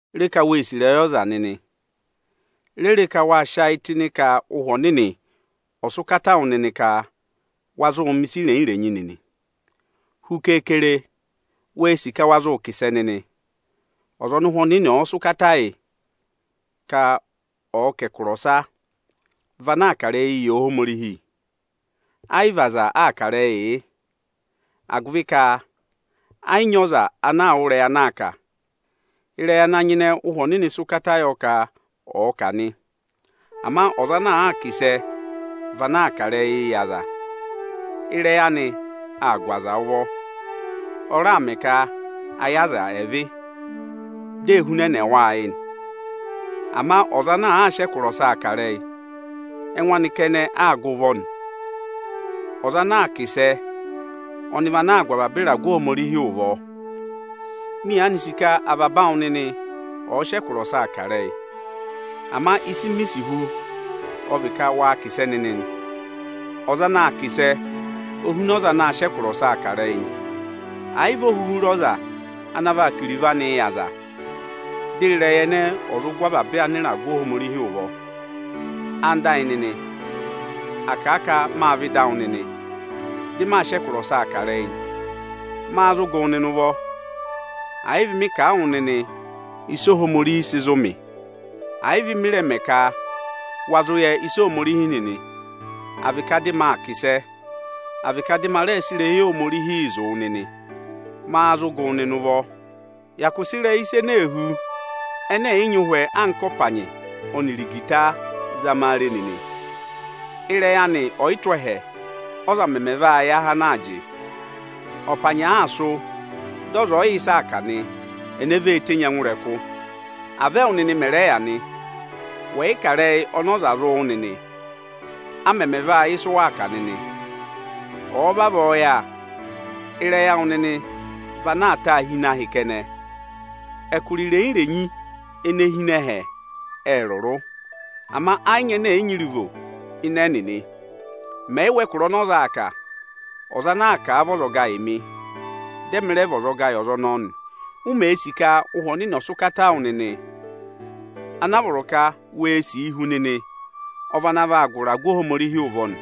Re ka wee sì ịrẹyị ọza nịnị! Re re ka waa sị ayị tụ́ ịnị ka Ụhwẹ Ohomorihi ọ̀ sị ụkata wụ nịnị ka wa zụụ mẹ̀ ịsa irenyi-irenyi nịnị. Hu keekere, wee sì ka wa zụụ kà ịsẹ nịnị. Ọza ọnị Ụhwẹ Ohomorihi sị ụkata yị ka ọ̀ọ kà ẹkụra ọsa vị ana aa kà ịrẹyị yị Ohomorihi. Ẹ yị vị aza aa kà ịrẹyịị yị, agụvị ka ẹ yị nyị ọza ana wụ́ ẹkụra ana aa kà. Ịrẹyị ana nyịnẹ Ụ́hwẹ Ohomorihi sị ụkata yọ ka ọ̀ọ kà nị. Ama ọza ana aa kà ịsẹ vị ana aa kà ịrẹyịị yị aza. Ịrẹyị anị aa gụ aza ụvọ, ọ raa mẹ ka ayị aza ẹ̀ vị, dị èe hunẹnẹ wa ayị. Ama ọza ana aa sị ẹkụra ọsaa kà ịrẹyị, ẹngụ anị kẹnẹ aa gụ ụvọ nị. Ọza ana aa kà ịsẹ ọnị vị ana aa gụ avaba ịragụ Ohomorihi ụvọ. Mị yaanị sì ka avaba awụ nịnị ọ̀ọ sị ẹkụra ọsaa kà ịrẹyị. Ama ịsị mi sì hu ọ vị ka waa kà ịsẹ nịnị nị, ọza ana aa kà ịsẹ o huna ọza ana aa sị ẹkụra ọsaa kà ịrẹyị nị; ẹ̀ yị vị o huhu re ọza ana vaa kà iruvo anịị yị aza, dị ịrẹyị ẹnẹẹ ẹ̀ zụ gụ avaba ịragụ Ohomorihii ụvọ. Ẹwụ nịnị ẹyịnyara amị, à kà a ka maa vẹ ịdị awụ nịnị, dị maa sị ẹkụra ọsaa kà ịrẹyị. Máá zụ gụ wụ nịnị ụvọ? Ẹ̀ yị vị mị kà a wụ nịnị ịsị Ohomorihi sị zụ mị; ẹ̀ yị vị mị rẹ mẹ ka wa zụ yẹ ịsa Ohomorihi nịnị, à vị ka dị ma kà ịsẹ, à vị ka dị ma rẹ sị ịrẹyị Ohomorihi zụ wụ nịnị, máá zụ gụ wụ nịnị ụvọ? Hyakụ sị ịrẹyị ịsa ene ee hú, ẹnẹ ẹ̀ yị nyị ụhwẹ, anka ọpanyị, à vị igita avọọ zama a re nịnị! Ịrẹyị anị ẹ̀ yị tụ́ ẹhẹ, ọza mẹmẹ vaa yẹ ahẹ ana aa jị? Ọpanyị àaa sụ́, dị ọza ẹ̀ yị yẹ ịsa aa kà nị, ene vee tenyi ẹngụ ịrẹkụ? Avọọ ẹwụ nịnị mẹ rẹ yà nị. Wẹ̀ yị kà ẹkụra ọnị ọza aa wụ́ nịnị, a mẹmẹ vaa yẹ ịsị ụ kà nịnị? Ọ̀ọ vavọọ yà, ịrẹyị awụ nịnị vị ana aa taa hi ịnị ahị kẹnẹ. Ẹkụra irenyi-irenyi ene hi ịnị ẹhẹ, ệ rụrụ. Ama ẹ yị nyị ẹnẹ ẹ̀ yị nyị iruvo ịnị ẹnịnị. Mẹ̀ yị wụ́ ẹkụra ọnị ọza aa kà, ọza ana aa kà a vị ọzọga yị mị, dị ẹmị rẹ vị ọzọga yị ọza ọnọọ nị. U mèe sì ka Ụhwẹ Ohomorihi ọ̀ sị ụkata wụ nịnị, ana a vọrọ ka wee sìi hu nịnị ọ vị ana vaa gụ ịragụ Ohomorihi ụvọ nị.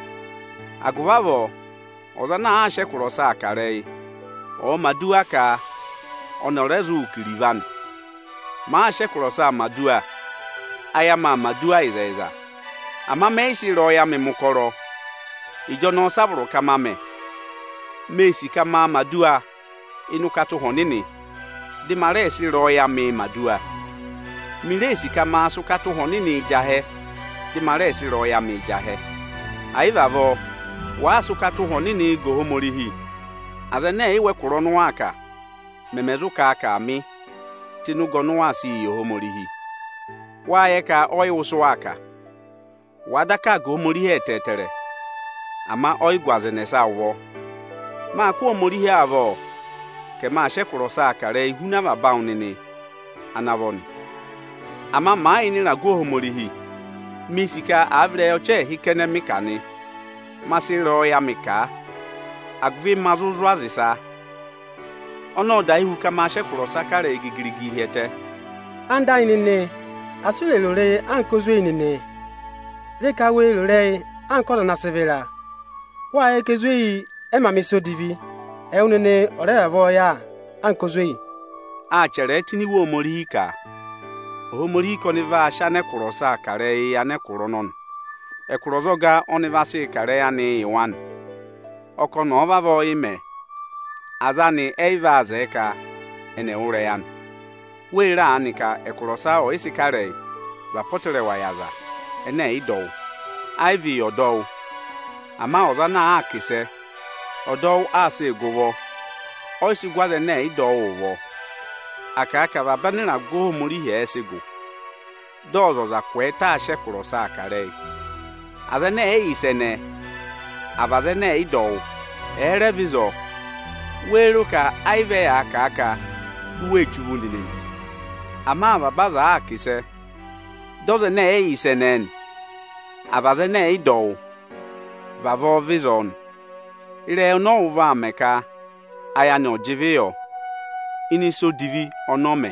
Agụvị avọọ, ọza ana aa sị ẹkụra ọsaa kà ịrẹyị, ọ̀ mẹ̀ aduwa ka ọnị ọ̀ rẹ zụụ kà iruvo anị. Màaa sị ẹkụra ọsaa mẹ̀ aduwa, ayị amị aa mẹ̀ aduwa ịzẹyịza, ama mẹ yị sị ịrẹyọyẹ amị mẹ̀ ụkọrọ. Ịjọnọọ sị a vọrọ ka ma mẹ? Mee sì ka maa mẹ̀ aduwa ịnị ụkata Ụhwẹ Ohomorihi, dị ma rẹẹ sị ịrẹyọyẹ amịị mẹ̀ aduwa. Mi ree sì ka maa sị ụkata Ụhwẹ Ohomorihi jị ahẹ, dị mị raa sị ịrẹyọyẹ amịị jị ahẹ. È yị vị avọọ, wàaa sị ụkata Ụhwẹ Ohomorihi ga Ohomorihi, aza ẹnẹ ẹ̀ yị wụ́ ẹkụra ọnị ụ waa kà, mẹmẹ zụ kà a ka, “Aamị” tụ́ ịnị ụga ọnị ụ waa sịị yị Ohomorihi? Wâ yẹ ka ọ yị wụ́ ịsị ụ waa kà. Ọ̀ọ daka vị ka wàa aa ga Ohomorihi ẹtẹẹtẹrẹ, ama ọ yị gụ ọza ẹnẹsa ụvọ. Mâ kụ́ Ohomorihi avọ ka ẹmị aa sị ẹkụra ọsaa kà ịrẹyị huna avaba awụ nịnị ana vọ nị. Ama màa yà ịnị ịragụ Ohomorihi, miī sì ka àa vị ịrẹyị ọchị ẹẹhị kẹnẹ mị kà nị, ma sị ịrẹyọyẹ amị kà a, agụvị ma zụ zụ̀ aza ịsa. Ọnọọ ọ dahi hu ka maa sị ẹkụra ọsaa kà ịrẹyị gigirigii hi ẹtẹ nị. Ẹwụ nịnị ẹyịnyara amị, asị u rè ro ịrẹyị anka ezweyi nịnị! Re ka wee ro ịrẹyị anka ọza ana sị vịra! Wâ yẹ ka ezweyi ẹ mā mẹ̀ ịsa odivi; ẹwụ nịnị ọ̀ rẹ vavọọ yà anka ezweyi! Â chẹrẹẹ tụ́ ini Iwe Ohomorihi ka, “Ohomorihi ka ọnị vaa sị anẹkụra ọsa kà ịrẹyịị yị anẹkụra ọnọnị. Anẹkụra ọzọga ọ́nị vaa sị kà ịrẹyịị yị wa nị. Ọ kà ọnị ọ̀ọ vavọọ yị mẹ, aza anị ẹ yị vaa zẹẹ ka ẹnị ẹ̀ wụ́ ịrẹyị anị.” Wee re aanị ka ẹkụra ọsa ọyịsị kà ịrẹyị vị apọtẹrẹwa yị aza ẹnẹ ẹ̀ yị dọ wụ́, ẹ yị vị yị ọdọwụ. Ama ọza ọnị àa kà ịsẹ, ọdọwụ aa sịị gụ ụvọ nị, ọ yị sị gụ aza ẹnẹ ẹ̀ yị dọ wụ́ ụvọ. À kà a ka avaba anịragụ Ohomorihi ẹ sị gụ, dị ọzọza kwẹẹtẹ aa sị ẹkụra ọsaa kà ịrẹyị. Aza ẹnẹ ẹ̀ yị yẹ ịsa ẹnẹẹ, àa vị aza ẹnẹ ẹ̀ yị dọ wụ́, ẹ̀ẹ rẹ vẹ ịzọọ, wéé ro ka ayị vị ẹyaa kà a ka u wee che uvu nịnị nị? Ama avaba aza àaa kà ịsẹ, dị ọza ẹnẹ ẹ̀ yị yẹ ịsa ẹnẹẹ, àa vị aza ẹnẹ ẹ̀ yị dọ wụ́, vavọọ vẹ ịzọọ nị, ịrẹyị ọnị ọ wụ́ vaa mẹ ka ayị anị ọ̀ jị ịvị yọ ịnị ịsa odivi ọnị ọ mẹ.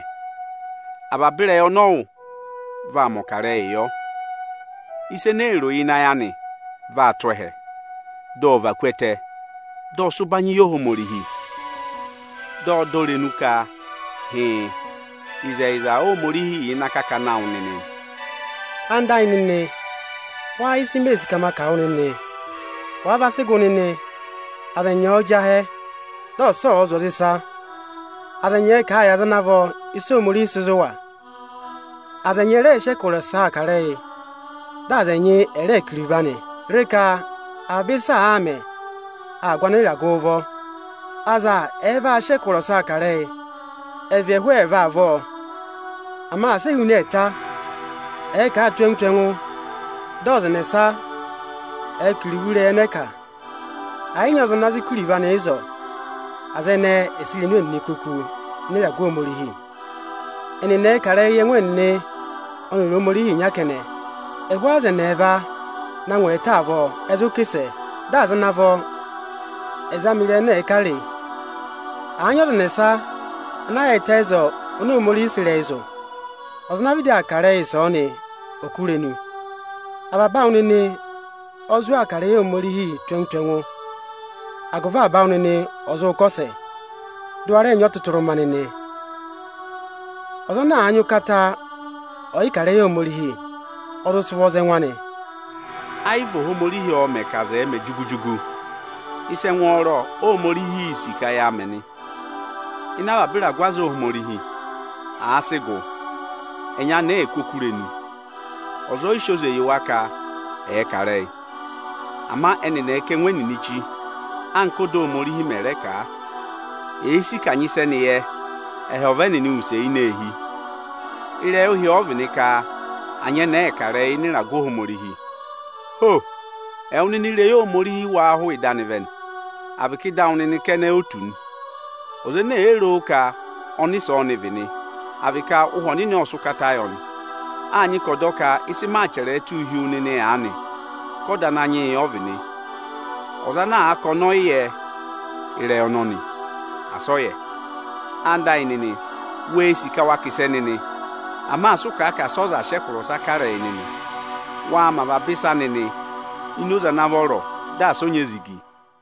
Avaba ịrẹyị ọnị ọ wụ́ vaa mẹ̀ ọkarẹyị yọ. Ịsa ene ee ro ịnị ayị anị vaa tụ́ ẹhẹ, dị ọ và ku ẹtẹ, dị ọ sị ụbanyị yị Ohomorihi. Dị ọ dọ irenu ka hịịn, ịzẹyịza Ohomorihi yà ịnị akakana awụ nịnị. Ẹwụ nịnị ẹyịnyara amị, wáá yẹ ịsị mee sì ka ma kà wụ nịnị? Wàa va sị gụ nịnị, aza ẹnyị ẹ̀ẹ jị ahẹ, dị ọsa ọ̀ọ zụ̀ aza ịsa! Aza ẹnyị ẹ̀ẹ kà a yị aza ana vọ ịsị Ohomorihi sị zụ̀ wa! Aza ẹnyị ẹ̀ rẹẹ sị ẹkụra ọsaa kà ịrẹyị, dị aza ẹnyị ẹ̀ rẹẹ kà iruvo anị. Re ka avaba ịsị àaa mẹ, aa gụ anịragụụ ụvọ! Aza ẹ̀ẹ vaa sị ẹkụra ọsaa kà ịrẹyị, ẹ̀ vị ẹhụụ ẹẹva avọọ, ama asị e huna ẹẹta! Ẹ̀ẹ kà a tù ẹngụ tù ẹngụ, dị ọza ẹnẹsa ọ̀ọ kà iruvo ịrẹyị ẹnẹ ẹ kà! Ẹ̀ yị nyị ọza ana zụ kà iruvo anị ịzọọ, aza ẹnẹẹ ẹ̀ sị irenu ẹnịnị kú oku ịnị ịragụ Ohomorihi! Ẹnịnị ẹẹ kà ịrẹyị yị ẹngụ ẹnịnị ọnịrị Ohomorihi ịnya kẹnẹ! Ẹhụụ aza ẹnị ẹẹva na ngụ ẹẹta avọọ ẹ zụ aa kà ịsẹ, dị aza ana vọ ẹ̀ẹ zama ịrẹyị ẹnẹ ẹ kà re! Àa nyị ọza ẹnẹsa ana yaayịtẹ ịzọọ oni Ohomorihi sị ịrẹyị zụ̀, ọza ana vịdị aa kà ịrẹyị ịsọọnị ò kú irenu! Avaba awụ nịnị ọ zụ aa kà ịrẹyị Ohomorihii tù ẹngụ tù ẹngụ, agụvị avaba awụ nịnị ọ̀ zụ kọsẹ, dị ụ wa rẹ nyị ọtụtụrụma nịnị! Ọza ana nyị ụkata ọyịkà ịrẹyị Ohomorihi, ọ̀ zụ sị ụvọ za ẹngụ anị! Ẹ yị vị Ohomorihi ọọ̄ mẹ̀ ka aza ẹ̀ẹ mẹ jugu-jugu. Ịsa ẹngwọọrọ Óhomorihiī sì ka yaa mẹ nị. Ịnị avaba ịragụ aza Ohomorihi, àa sị gụ, anyẹnẹẹ èe kú oku irenu. Ọza ọ yị sị oze yị wa ka ẹ̀ẹ kà ịrẹyị. Ama ẹnịnị ẹ̀ kà ẹngụ ẹnịnị chí, anka ọ́da Ohomorihi mẹ̀ rẹ kà a. Èe sì ka à nyị ịsị ẹnị yẹ, ẹ̀ họ̀ ọva ẹnịnị use ini eehi! Ịrẹyị ụhị ọ vị nị ka anyẹnẹẹ ẹ̀ẹ kà ịrẹyị ịnị ịragụ Ohomorihi nị. Ho! Ẹwụ nịnị ị́rẹyị Ohomorihi wáá hụụ ịdị anị vẹ nị, à vị ka ịdị awụ nịnị kẹnẹ o tù nị? Ọza ene èe ro ka ọnịsẹ ọ́nị vị nị, à vị ka Ụhwẹ Ohomorihi ộ sị ụkata yị ọnị, â nyị ka ọ̀ dọ ka ịsị maa chẹrẹẹ tụ́ụ hi wu nịnị aanị ka ọda Ananyị yị ọ vị nị. Ọza ana àa ka ọnị ọ yị yẹ ịrẹyị ọnọnị, asị ọ yẹ! Ẹwụ nịnị ẹyịnyara amị, wee sì ka waa kà ịsẹ nịnị! Ama asị ụ kà a ka asị ọza rẹ̀ sị ẹkụra ọsa kà ịrẹyị nịnị! Waa mẹ avaba ịsa nịnị ini oze ana vọrọ, dị asị ọ nyị ezigi!